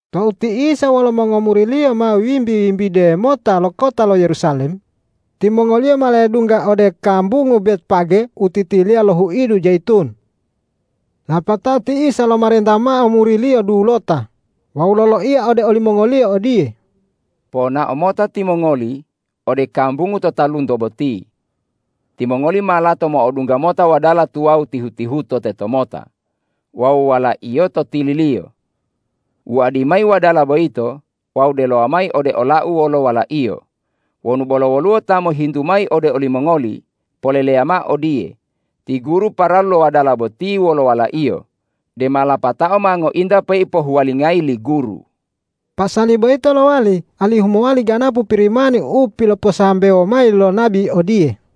Tou ti Isa wolo mongomuri-Liyo ma wimbi-wimbide mota lo kota lo Yerusalem, timongoliyo ma ledungga ode kambungu Betfage u titiliya lo huidu Jayitun. Lapatao ti Isa lomarenta mao muri-Liyo dulota wawu loloiya ode olimongoliyo odiye,”Ponao mota timongoli ode kambungu to talunto boti. Timongoli ma lato mo'odungga mota wadala tuwawu tihu-tihuto tetomota wawu walaiyo to tililiyo. Wuadi mayi wadala boyito wawu delowa mayi ode ola-U wolo walaiyo. Wonu bolo woluwo ta mohintu mayi ode olimongoli, poleleya mao odiye, ’Ti Guru, paralu lo wadala boti wolo walaiyo, dema lapatao ma ngointa peipohuwalingayi li Guru.’” Pasali boyito lowali alihu mowali ganapu Pirimani u piloposambewo mayi lo nabi odiye,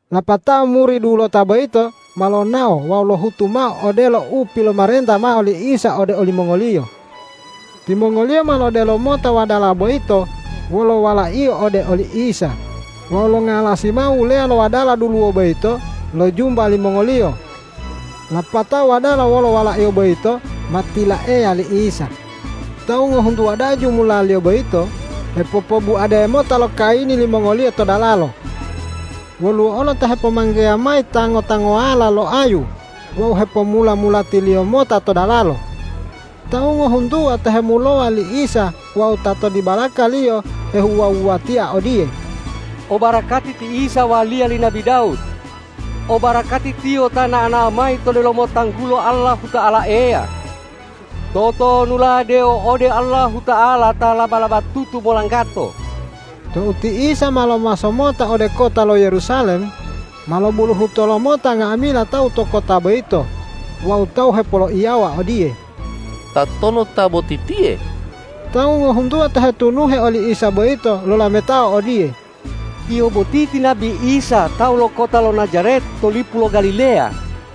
Lapatao muri dulota boyito ma lonao wawu lohutu mao odelo u pilomarenta mao li Isa ode olimongoliyo. Timongoliyo ma lodelo mota wadala boyito wolo walaiyo ode oli Isa wawu longalasi mao wuleya lo wadala duluwo boyito lo jumba limongoliyo. Lapatao wadala wolo walaiyo boyito ma tilaeya li Isa. Tawu ngohuntuwa da'a jumulaliyo boyito hepopobuade mota lo kayini limongoliyo to dalalo. Woluwo olo ta hepomanggeya mayi tango-tangowala lo ayu wawu hepomula-mulatiliyo mota to dalalo. Tawu ngohuntuwa ta hemulowa li Isa wawu ta to dibalaka-Liyo hewuwa-wuwatia odiye,”Obarakati ti Isa waliya li nabi Dawud. Obarakati Tiyo ta nao-nao mayi to delomo tanggulo Allahuta'ala Eya. Totonula dewo ode Allahuta'ala ta laba-labatutu molanggato.” Tou ti Isa ma lomaso mota ode kota lo Yerusalem, ma lobuluhuto lomota nga'amila tawu to kota boyito wawu tawu hepoloiyawa odiye,”Tatonu ta boti tiye?” Tawu ngohuntuwa ta hetunuhe oli Isa boyito lolametao odiye,”Tiyo boti ti nabi Isa tawu lo kota lo Najaret to lipu lo Galileya.”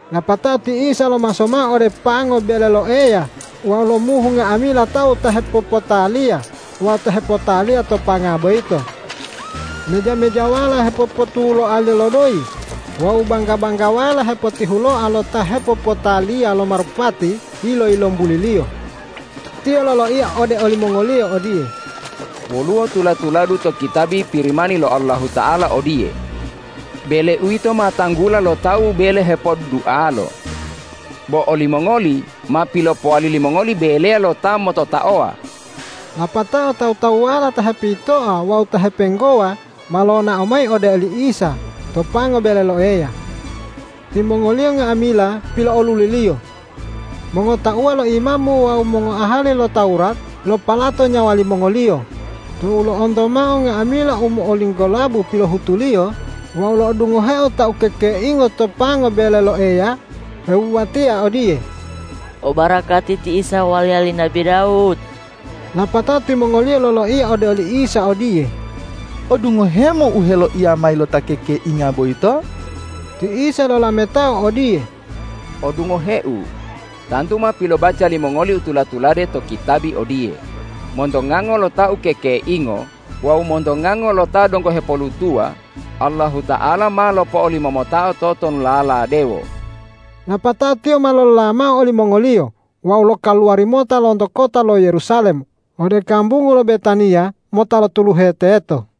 Lapatao ti Isa lomaso mao ode pango bele lo Eya wawu lomuhu nga'amila tawu ta hepopotaliya wawu ta hepotaliya to panga boyito. Meja-mejawala hepopotuloaliyo lo doyi wawu bangga-banggawala hepotihuloa lo ta hepopotaliya lo marupati yilo-yilombuli-Liyo. Tiyo loloiya ode olimongoliyo odiye,”Woluwo tula-tuladu to kitabi Pirimani lo Allahuta'ala odiye, ’Bele-U yito ma tanggula lo tawu bele hepoddualo.’ Bo olimongoli ma pilopowali limongoli beleya lo ta mototaowa.” Lapatao tawu-tawuwala ta hepitoa wawu ta hepenggowa ma lonao mayi ode oli Isa to pango bele lo Eya. Timongoliyo nga'amila pilo'oluli-Liyo. Mongotauwa lo imamu wawu mongoahali lo Tawurat lopalato nyawa limongoliyo tou lo'onto mao nga'amila u mo'olinggolabu pilohutu-Liyo wawu lo'odungoheo ta ukekeingo to pango bele lo Eya hewuwatia odiye,”Obarakati ti Isa waliya li nabi Dawud!” Lapatao timongoliyo loloiya ode oli Isa odiye,”Odungohe-Mu u heloiya mayi lo ta ukekeinga boyito?” Ti Isa lolametao odiye,”Odungohe-U, tantu ma pilobaca limongoli u tula-tulade to kitabi odiye, ’Monto ngango lo ta ukekeingo wawu monto ngango lo ta donggo hepolutuwa Allahuta'ala ma lopo'olimomotao totonulala dewo.’” Lapatao Tiyo ma lolola mao olimongoliyo wawu lokaluwari mota lonto kota lo Yerusalem ode kambungu lo Betaniya mota lotuluhe teto.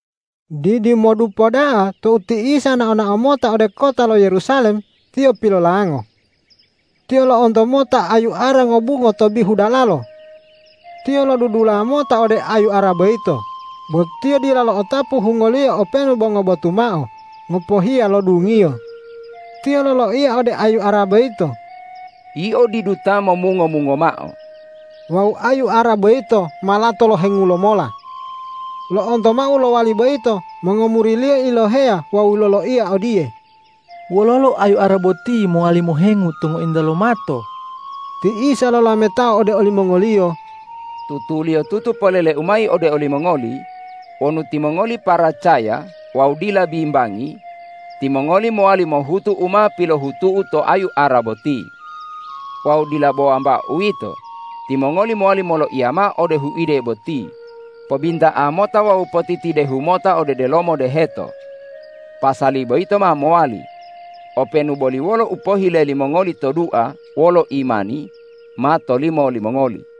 Didimodupo da'a tou ti Isa nao-nao mota ode kota lo Yerusalem, Tiyo pilolango. Tiyo lo'onto mota ayu ara ngobungo to bihu dalalo. Tiyo lodudula mota ode ayu ara boyito, bo Tiyo dila lo'otapu hungoliyo openu bo ngobotu mao ngopohiya lo dungiyo. Tiyo loloiya ode ayu ara boyito,”Yio didu ta momungo-mungo mao.” Wawu ayu ara boyito ma lato lohengu lomola. Lo'onto mao u lowali boyito mongomuri-Liyo iloheya wawu loloiya odiye,”Wololo ayu ara boti mowali mohengu tou ngointa lomato?” Ti Isa lolametao ode olimongoliyo,”Tutuliyotutu polele-U mayi ode olimongoli: Wonu timongoli paracaya wawu dila bimbangi, timongoli mowali mohutu u ma pilohutu-U to ayu ara boti. Wawu dila bo wambao uwito, timongoli mowali moloiya mao ode huide boti: Pobinta'a mota wawu potitidehu mota ode delomo deheto! Pasali boyito ma mowali. Openu boli wolo u pohile limongoli to dua wolo imani, ma tolimo limongoli.”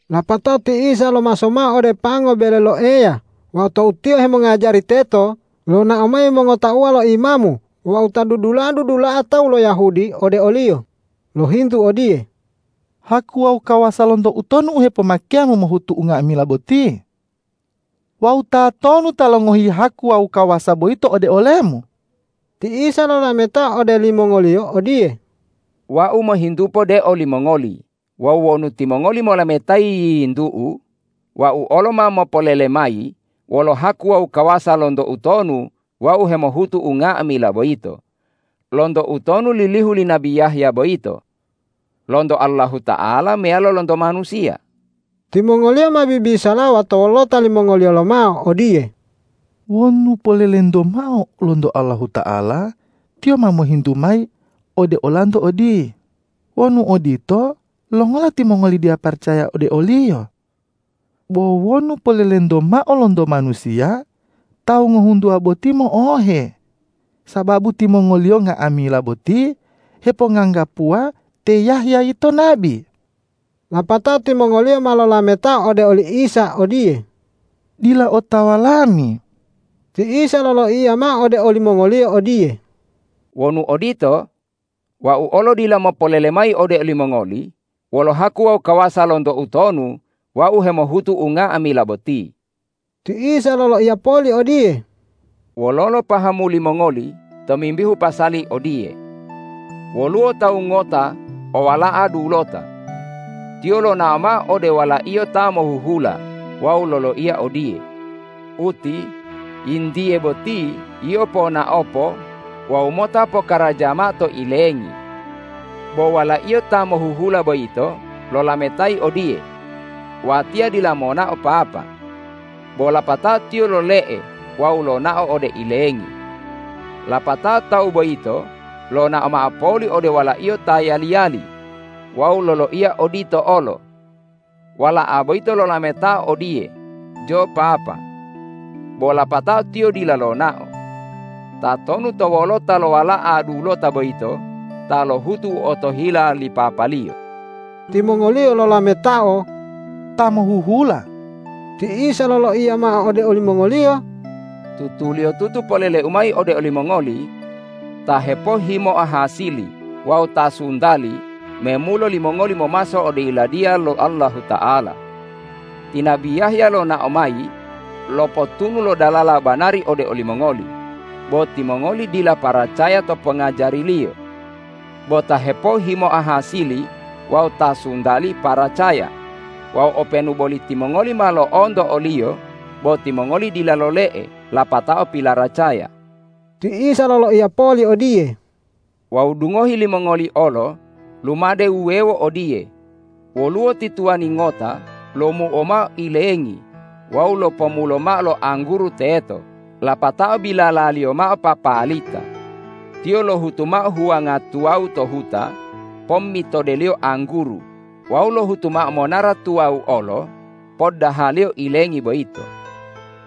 Lapatao ti Isa lomaso mao ode pango bele lo Eya wawu tou Tiyo hemongajari teto, lonao mayi mongotauwa lo imamu wawu ta dudula'a-dudula'a tawu lo Yahudi ode o-Liyo, lohintu odiye,”Haku wawu kawasa lonto utonu u hepomake-Mu mohutu unga'amila boti? Wawu tatonu ta longohi haku wawu kawasa boyito ode ole-Mu?” Ti Isa lolametao ode limongoliyo odiye,”Wau mohintupo de olimongoli wawu wonu timongoli molametayi yiyintu-U, Wau olo ma mopolele mayi wolo haku wawu kawasa lonto utonu Wau hemohutu unga'amila boyito. Lonto utonu lilihu li nabi Yahya boyito? Lonto Allahuta'ala meyalo lonto manusiya?” Timongoliyo ma bibisalawa to wolota limongoliyo lomao odiye,”Wonu polelento mao lonto Allahuta'ala, Tiyo ma mohintu mayi ode olanto odiye, ’Wonu odito, longola timongoli dila paracaya ode oliyo?’ Bo wonu polelento mao lonto manusiya, tawu ngohuntuwa botiye mo'ohe, sababu timongoliyo nga'amila boti heponganggapuwa te Yahya yito nabi.” Lapatao timongoliyo ma lolametao ode oli Isa odiye,”Dila otawa lami.” Ti Isa loloiya mao ode olimongoliyo odiye,”Wonu odito, Wau olo dila mopolele mayi ode olimongoli wolo haku wawu kawasa lonto utonu Wau hemohutu unga'amila boti.” Ti Isa loloiya poli odiye,”Wololo pahamu limongoli tomimbihu pasali odiye? Woluwo tawu ngota owala'a dulota. Tiyo lonao mao ode walaiyo ta mohuhula wawu loloiya odiye, ’Uti, yintiye boti yio ponaopo wawu mota pokaraja mao to ilengi.’ Bo walaiyo ta mohuhula boyito lolametayi odiye, ’Watiya dila monao papa.’ Bo lapatao tiyo lole'e wawu lonao ode ilengi. Lapatao tawu boyito lonao mao poli ode walaiyo ta yali-yali wawu loloiya odito olo. Wala'a boyito lolametao odiye, ’Jo papa.’ Bo lapatao tiyo dila lonao. Tatonu to wolota lo wala'a dulota boyito ta lohutu u otohila li papaliyo?” Timongoliyo lolametao,”Ta mohuhula.” Ti Isa loloiya mao ode olimongoliyo,”Tutuliyotutu polele-U mayi ode olimongoli: Ta hepohhimoa hasili wawu ta suntali memulo limongoli momaso ode Yiladiya lo Allahuta'ala. Ti nabi Yahya lonao mayi lopotunu lo dalala banari ode olimongoli, bo timongoli dila paracaya to pongajariliyo. Bo ta hepohhimoa hasili wawu ta suntali paracaya. Wawu openu boli timongoli ma lo'onto oliyo, bo timongoli dila lole'e lapatao pilaracaya.” Ti Isa loloiya poli odiye,”Wawu dungohi limongoli olo lumade wuwewo odiye: Woluwo ti tuwani ngota lomuo mao ilengi wawu lopomulo mao lo angguru teto lapatao bilalaliyo mao papalita. Tiyo lohutu mao huwanga tuwawu to huta pommitodeliyo angguru wawu lohutu mao monara tuwawu olo poddahaliyo ilengi boyito.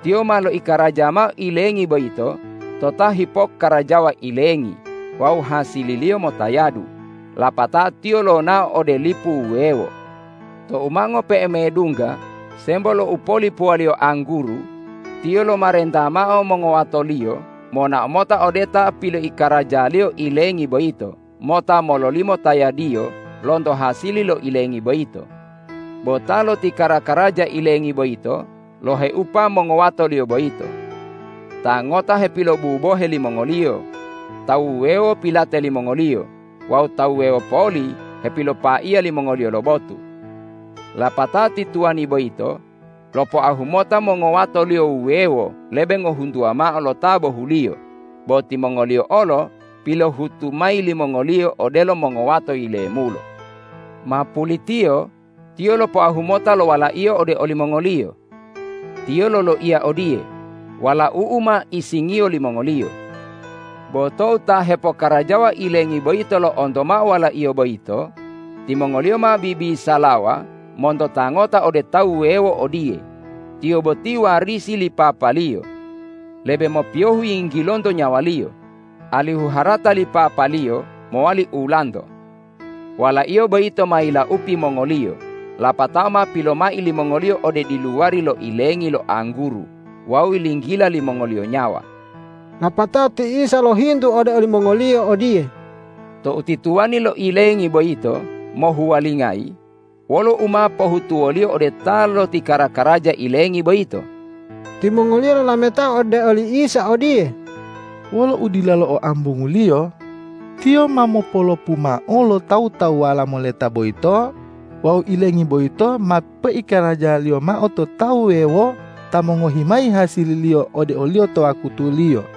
Tiyo ma loikaraja mao ilengi boyito to ta hipokkarajawa ilengi wawu hasililiyo motayadu, lapatao tiyo lonao ode lipu wuwewo. Tou ma ngope'e medungga sembo lo upolipuwaliyo angguru, tiyo lomarenta mao mongowatoliyo monao mota ode ta piloikarajaliyo ilengi boyito mota mololimo tayadiyo lonto hasili lo ilengi boyito. Bo ta loti kara-karaja ilengi boyito loheupa mongowatoliyo boyito. Ta ngota hepilobubohe limongoliyo, tawu wuwewo pilate limongoliyo, wawu tawu wuwewo poli hepilopaiya limongoliyo lo botu. Lapatao ti tuwani boyito lopoahu mota mongowatoliyo wuwewo lebe ngohuntuwa mao lo ta bohuliyo, bo timongoliyo olo pilohutu mayi limongoliyo odelo mongowato yilemulo. Ma pulitiyo tiyo lopoahu mota lo walaiyo ode olimongoliyo. Tiyo loloiya odiye, ’Walau'u ma isingiyo limongoliyo.’ Bo tou ta hepokarajawa ilengi boyito lo'onto mao walaiyo boyito, timongoliyo ma bibisalawa monto ta ngota ode tawu wuwewo odiye, ’Tiyo boti warisi li papaliyo. Lebe mopiyohu yinggilonto nyawaliyo, alihu harata li papaliyo mowali ulanto.’ Walaiyo boyito ma yilaupi mongoliyo, lapatao ma pilomai limongoliyo ode diluwari lo ilengi lo angguru wawu yilinggila limongoliyo nyawa.” Lapatao ti Isa lohintu ode olimongoliyo odiye,”Tou ti tuwani lo ilengi boyito mohuwalingayi wolo u ma pohutuwoliyo ode ta lotikara-karaja ilengi boyito?” Timongoliyo lolametao ode oli Isa odiye,”Wolo udilalo o ambunguliyo tiyo ma mopolopu mao lo tawu-tawuwala moleta boyito wawu ilengi boyito ma poikarajaliyo mao to tawu wuwewo ta mongohi mayi hasililiyo ode oliyo to wakutuliyo.”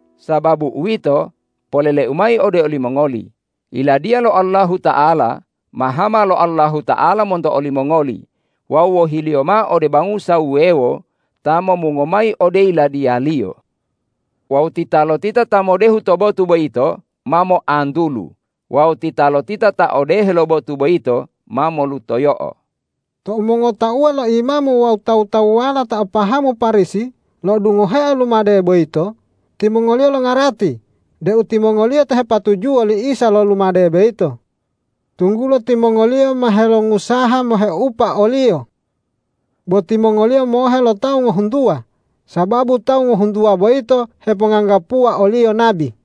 Sababu uwito, polele-U mayi ode olimongoli: Yiladiya lo Allahuta'ala ma hama lo Allahuta'ala monto olimongoli wawu wohi-Liyo mao ode bangusa wuwewo ta momungo mayi ode Yiladiya-Liyo. Wawu titalotita ta modehu to botu boyito ma moantulu wawu titalotita ta odehe lo botu boyito ma molutoyo'o.” Tou mongotauwa lo imamu wawu tawu-tawuwala ta o pahamu Parisi lo'odungoheo lumade boyito, timongoliyo longarati deu timongoliyo ta hepatujuwo li Isa lo lumade boyito, tunggulo timongoliyo ma helongusaha moheupa o-Liyo. Bo timongoliyo mohe lo tawu ngohuntuwa, sababu tawu ngohuntuwa boyito heponganggapuwa o-Liyo nabi.